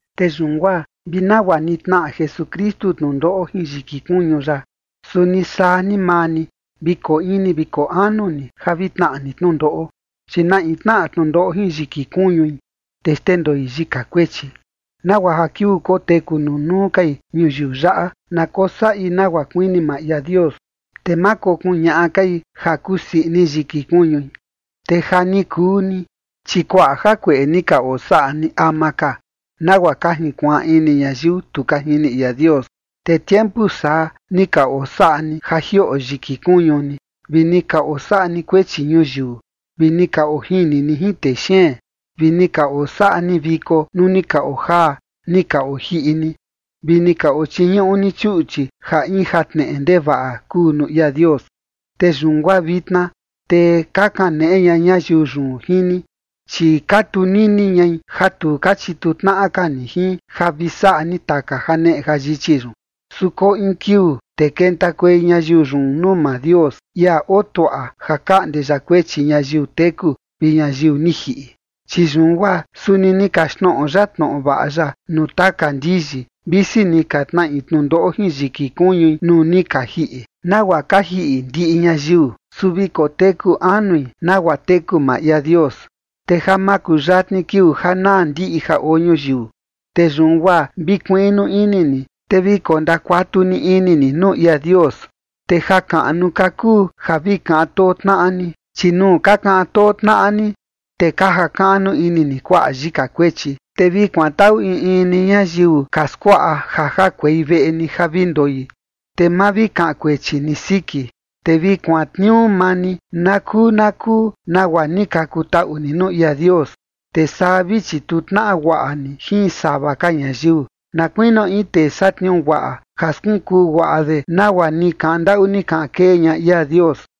Te yun guaa vi nagua ni tnaꞌa Jesukristu tnundoꞌo jin yiki kuñu ya, suni saa ni maa ni vi koo ini vi koo anu ni ja vi tnaꞌa ni tnundoꞌo, chi na in tnaꞌa tnundoꞌo jin yiki kuñui, te xndendoi yika kuechi, nagua ja kiuu koteku nunuu kai ñuyiu yaꞌa, na kosaꞌi nagua kuini maa ia Dios, te ma kokuñaꞌa kai ja kusii ini yiki kuñui. Te ja ni kuu ni, chi kuaꞌa jakueꞌe ni ka osaꞌa ni ama ka, nagua ka jinkuaan ini ñayiu tu ka jini ia Dios, te tiempu saa ni ka osaꞌa ni ja jioꞌo yiki kuñu ni, vi ni ka osaꞌa ni kuechi ñuyiu, vi ni ka ojini ni jin texeen, vi ni ka osaꞌa ni viko nuu ni ka ojaa ni ka ojiꞌi ni, vi ni ka ochiñuꞌu ni chuꞌchi ja in jatneꞌe ndevaꞌa kuu nuu ia Dios. Te yun guaa vitna, te ka kaneꞌe ña ñayiu yun jin ni, chi ka tunini ñai ja tu ka chituu tnaꞌa ka ni jin ja vi saꞌa ni taka janeꞌe jayichi yun. Su koo in kiuu, te kentakuei ñayiu yun nuu maa Dios, ia oo tuaꞌa ja kaꞌnde ya kuechi ñayiu teku vi ñayiu ni jiꞌi. Chi yun guaa suni ni kaxtnoꞌo ya tnoꞌo vaꞌa ya nuu taka ndiyi, visi ni ka tnaꞌi tnundoꞌo jin yiki kuñui nuu ni ka jiꞌi, nagua ka jiꞌi ndiꞌi ñayiu, su vi koteku anui nagua teku maa ia Dios. Te ja makuyatni kiuu ja naa ndiꞌi ja oo ñuyiu, te yun guaa vi kuiꞌnu ini ni, te vi kondakuatu ni ini ni nuu ia Dios. Te jakaꞌnu ka kuu ja vi kaꞌan too tnaꞌa ni, chi nuu ka kaꞌan too tnaꞌa ni, te ka jakaꞌnu ini ni kuaꞌa yika kuechi. Te vi kuantaꞌu in in ni ñayiu ka skuaꞌa ja jakuei veꞌe ni ja vi ndoi, te ma vi kaꞌan kuechi ni siki. Te vi kuantniuu maa ni na kuu na kuu nagua ni ka kutaꞌu ni nuu ia Dios, te saa vi chituu tnaꞌa guaꞌa ni jin sava ka ñayiu, na kuinio in tee satniuu guaꞌa, ja skunkuu guaꞌa de nagua ni kaꞌan ndaꞌu ni kaꞌan kee ña ia Dios.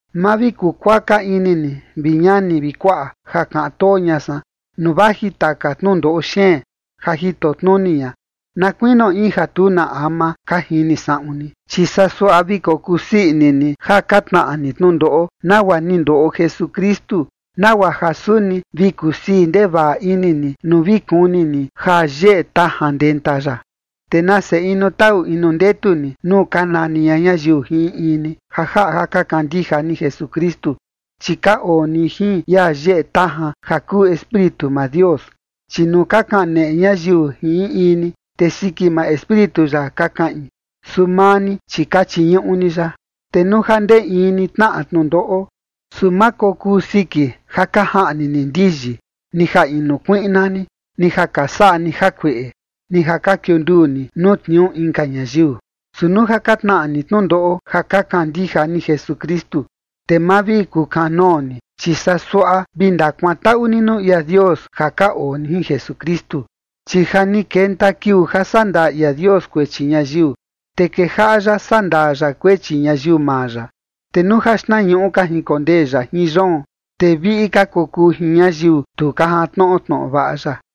Ma vi kukuaka ini ni, vi ñani vi kuaꞌa, ja kaꞌan too ña san, nuu vaji taka tnundoꞌo xeen ja jito tnuni ña, na kuinio in ja tu na ama ka jini saꞌun ni. Chi saa suaꞌa vi kokusii ini ni ja ka tnaꞌa ni tnundoꞌo, nagua ni ndoꞌo Jesukristu, nagua ja suni vi kusii ndevaꞌa ini ni nuu vi kuni ni ja yeꞌe tajan ndenta ya. Te nase inu taꞌu inu ndetu ni nuu ka nani ña ñayiu jin in in ni ja jaꞌa ja ka kandija ni Jesukristu, chi ka oo ni jin ia yeꞌe tajan, ja kuu Espíritu maa Dios. Chi nuu ka kaneꞌe ñayiu jin in in ni, te siki maa Espíritu ya ka kaꞌin, su maa ni, chi ka chiñuꞌu ni ya. Te nuu ja ndee in ni tnaꞌa tnundoꞌo, su ma kokuu siki ja ka jaꞌni ni ndiyi, ni ja inu kuiꞌna ni, ni ja ka saꞌa ni jakueꞌe, ni ja ka kiunduu ni nuu tniuu inka ñayiu. Su nuu ja ka tnaꞌa ni tnundoꞌo ja ka kandija ni Jesukristu, te ma vi kukanoo ni, chi saa suaꞌa vi ndakuantaꞌu ni nuu ia Dios ja ka oo ni jin Jesukristu. Chi ja ni kenta kiuu ja saꞌa ndaa ia Dios kuechi ñayiu, te kejaꞌa ya saꞌa ndaa ya kuechi ñayiu maa ya. Te nuu ja xtnañuꞌu ka jinkondee ya jin yoon, te viꞌi ka kokuu jin ñayiu tu ka jantnoꞌo tnoꞌo vaꞌa ya.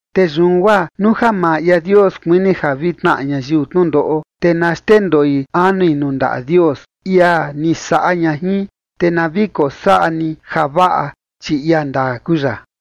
Te yun guaa nuu ja maa ia Dios kuini ja vi tnaꞌa ñayiu tnundoꞌo, te na xndendoi anui nuu ndaꞌa Dios, ia ni saꞌa ña jin, te na vi kosaꞌa ni javaꞌa, chi ia ndaa kuu ya.